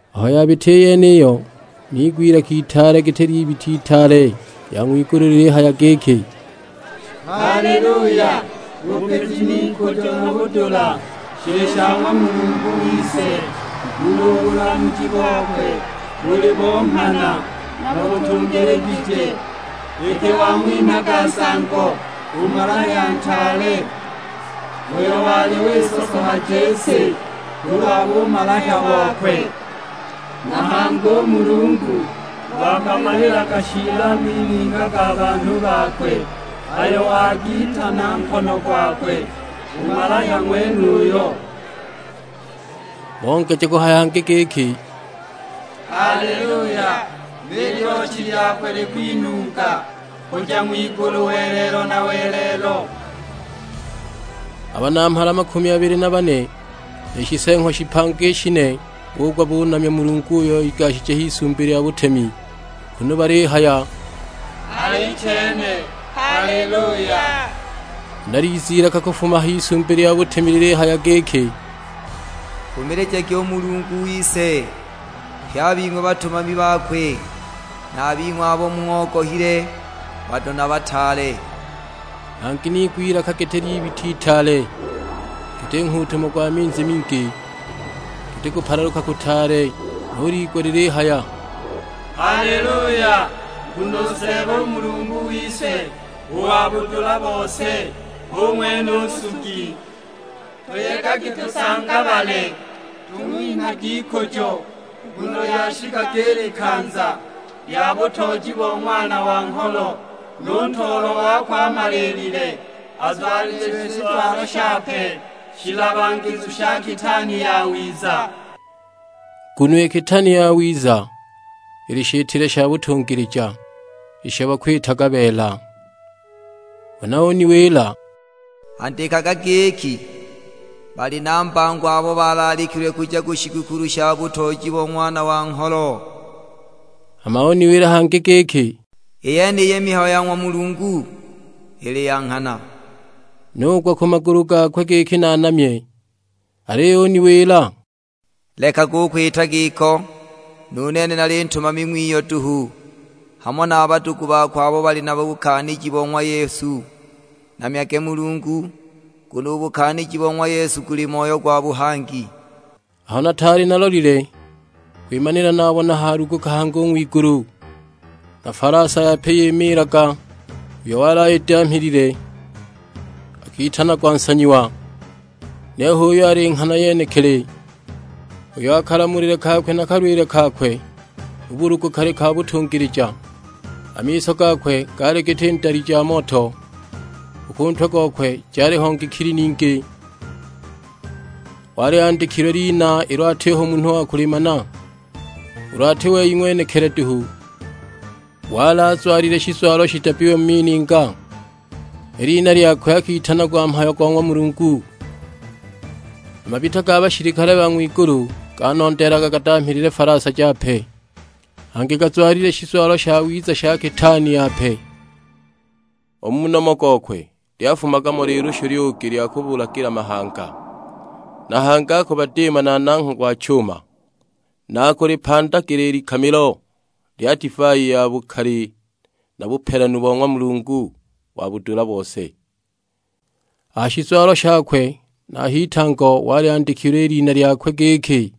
Aho yabita i yeniyo niigwa ilaka itaale giti ly'ibita itaale lya ng'wigulu lilihaya giki, "Haleluya, bupiji n'ikujo na budula shili sha ng'wa Mulungu wise; nguno u bulamuji bokwe buli bo nghana, na butungiligije. Iki wang'winhaga nsango u malahya ntaale, uyo wali wisosohaja i si kulwa bumalahya bokwe. Na hangi u Mulungu wagamalilaga shiili a mininga ga banhu bakwe, ayo wagiita na nkono gwakwe u malahya ng'wenuyo!" Bongeja kuhaya hangi giki, "Haleluya, ni lyochi lyakwe likwinunga kuja ng'wigulu welelo na welelo!" A Banamhala makumi abili na bane, ni Shiseeng'wa shipanga i shine bugwa balinamya Mulungu uyo igashije h'Isumbi lya butemi, kunu balihaya; "Alichene, Haleluya!" Huna liza ilaka kufuma a h'Isumbi lya butemi lilihaya giki, "Nkumilijagi u Mulungu wise pye a bing'we batumami bakwe; na a bing'we abo mung'ogohile, bado na bataale!" Hangi niigwa ilaka giti ly'ibita itaale, giti nghuutumo gwa minzi mingi, giti kupalaluka kutaale; nuliigwa lilihaya, "Haleluya, nguno u Seeba Mulungu wise, u wa budula bose, hu ng'wene u Nsugi! Tuyegagi tusangabale, tung'winhagi ikujo, nguno lyashikaga i likanza lya butooji bo Ng'wana wa Ngholo, nu Ntoolwa wakwe amaliilile. Azwalichiwe shizwalo shape shilabagizu sha kitaani yawiza." (Nguno i kitaani yawiza ili shitile sha butungilija, isho bakwitaga beela.) Huna uniwila, "Andikaga giki, 'Bali na mbango abo balaalikilwe kuja ku shigukulu sha butooji bo Ng'wana wa Ngholo.' " Hama uniwila hangi giki, "I yeniyi mihayo ya ng'wa Mulungu, ili ya nghana." Nugwa ku magulu gakwe giki naanamye; aliyo uniwila, "Lekaga u kwita giko, nu nene nali ntumami ng'wiyo duhu, hamo na a badugu bako abo bali na bukaaniji bo ng'wa Yesu. Namyage Mulungu, nguno u bukaaniji bo ng'wa Yesu guli moyo gwa buhangi!" Aho nataali nalolile kwimanila nabona haaluguka hangi u ng'wigulu, na falasa yape yimiilaga, uyo wali ayidamhilile akitanagwa Nsanyiwa, niyo h'uyo ali Nghana yenekili; uyo kalamulile na kalwile kakwe mu bulugu kali ka butungilija. A miso gakwe gaali giti ndali ja moto, u ku ntwe gokwe jaliho ngikili ningi; wali andikilwe lina ilo atiho munhu wa kulimana, ulu ati wei ng'wenekili duhu. Wali azwalile shizwalo shidabbiwe mu mininga; i lina lyakwe akitanagwa Mhayo go ng'wa Mulungu. A mabita ga bashilikale ba ng'wigulu ganondeelaga gadamhilile falasa jape, hangi gazwalile shizwalo shawiza sha kitaani yape. U mu nomo gokwe lyafumaga mo lilushu lyugi lya kubulagila mahanga; na hangi akubadiima na nangha gwa chuma, na akulipandagila i likamilo lya divai ya bukali na bupelanu bo ng'wa Mulungu wa budula bose. A ha shizwalo shakwe na a h'itango wali andikilwe i lina lyakwe; giki,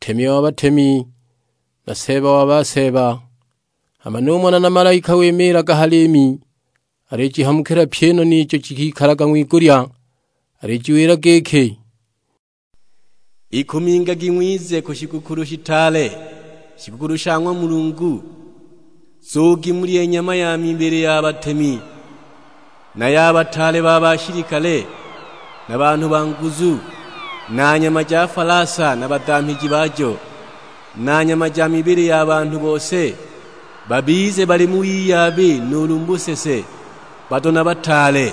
NTEMI WA BATEMI, NA SEEBA WA BASEEBA. Hama numona na malaika wimiilaga ha liimi alijihamukila pyi i noni ijo jikalalaga ng'wigulya, alijiwila giki, "Ikumingagi ng'wize ku shigukulu shitaale, shigukulu sha ng'wa Mulungu. Nzugi mulye nyama ja mibili ya batemi, na ya bataale ba bashilikale, na banhu ba nguzu; na nyama ja falasa na badamhiji bajo, na nyama ja mibili ya banhu bose, babize bali mu wiyabi nuulu mu busese, bado na bataale."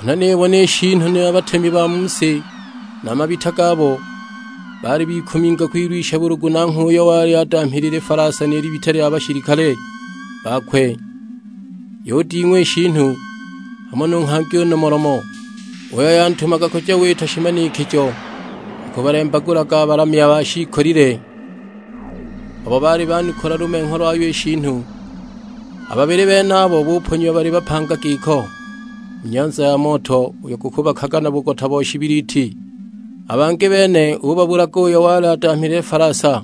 Huna nibona i shiinu, na a batemi ba mu si na a mabita gabo. Baali bikuminga kwilwisha bulugu nanghwe uyo wali adamhilile falasa ni libita lya bashilikale bakwe. Yuding'wa i shiinu, hamo nu nghangi u nomolomo, uyo yantumaga kuja wita shimanikijo akubalembagulaga a balamya ba shiikolile, abo baali banukula lumengho lwayo i shiinu. A babili benabo buponyiwa bali bapanga giko, mu nyanza ya moto uyo gukubakaga na bugota bo shibiliti. A bangi bene ubabulaga uyo wali adamhilile falasa;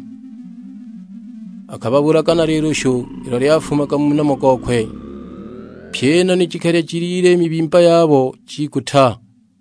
akababulaga na lilushu ilo lyafumaga mu nomo gokwe. Pyi i noni jikalya jilile i mibimba yabo, jiguta!